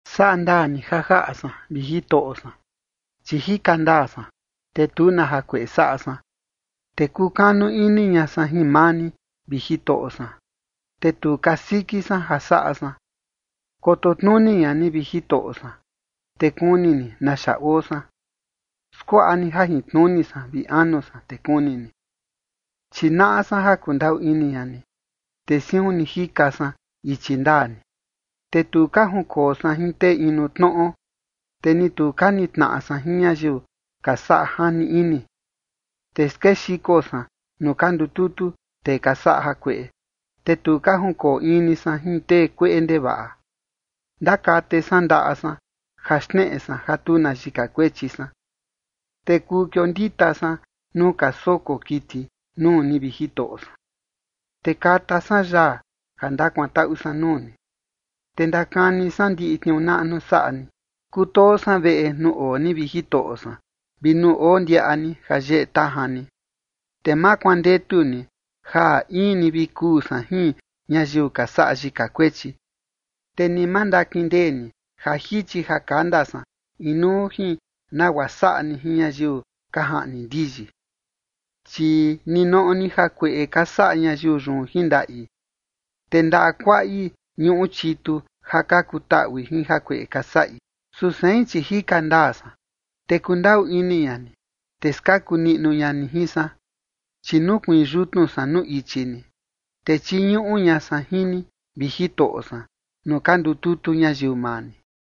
Saꞌa ndaa ni ja jaꞌa san, vi Jitoꞌo san, chi jika ndaa san, te tu na jakueꞌe saꞌa san, te kukanu ini ña san jin maa ni, vi Jitoꞌo san, te tu kasiki san ja saꞌa san. Koto tnuni ña ni, vi Jitoꞌo san, te kuni ni naxa oo san. Skuaꞌa ni jajintnuni san vi anu san, te kuni ni. Chi naꞌa san ja kundaꞌu ini ña ni, te siun ni jika san ichi ndaa ni. Te tu ka junkoo san jin tee inu tnoꞌo, te ni tu ka nitnaꞌa san jin ñayiu ka saꞌa jani ini. Te skexiko san nuu ka ndututu tee ka saꞌa jakueꞌe, te tu ka junkoo in ni san jin tee kueꞌe ndevaꞌa. Ndakate san ndaꞌa san ja xneꞌe san ja tu na yika kuechi san, te kuu kiondita san nuu ka soko kiti nuu ni, vi Jitoꞌo san. Te kata san yaa ja ndakuantaꞌu san nuu ni, te ndakani san ndiꞌi tniuu naꞌnu saꞌa ni. Kutoo san veꞌe nuu oo ni, vi Jitoꞌo san, vi nuu oo ndiaꞌa ni ja yeꞌe tajan ni. Te ma kuandetu ni ja in ni vi kuu san jin ñayiu ka saꞌa yika kuechi, te ni ma ndakindee ni ja jichi ja kanda san inuu jin nagua saꞌa ni jin ñayiu ka jaꞌni ndiyi. Chi ninoꞌo ni jakueꞌe ka saꞌa ñayiu yun jin ndaꞌi, te ndaꞌa kuaꞌi ñuꞌu chitu ja ka kutaꞌui jin jakueꞌe ka saꞌi. Su sein, chi jika ndaa san, te kundaꞌu ini ña ni, te skaku niꞌnu ña ni jin san. Chi nukuiin yutnu san nuu ichi ni, te chiñuꞌu ña san jin ni, vi Jitoꞌo san, nuu ka ndututu ñayiu maa ni.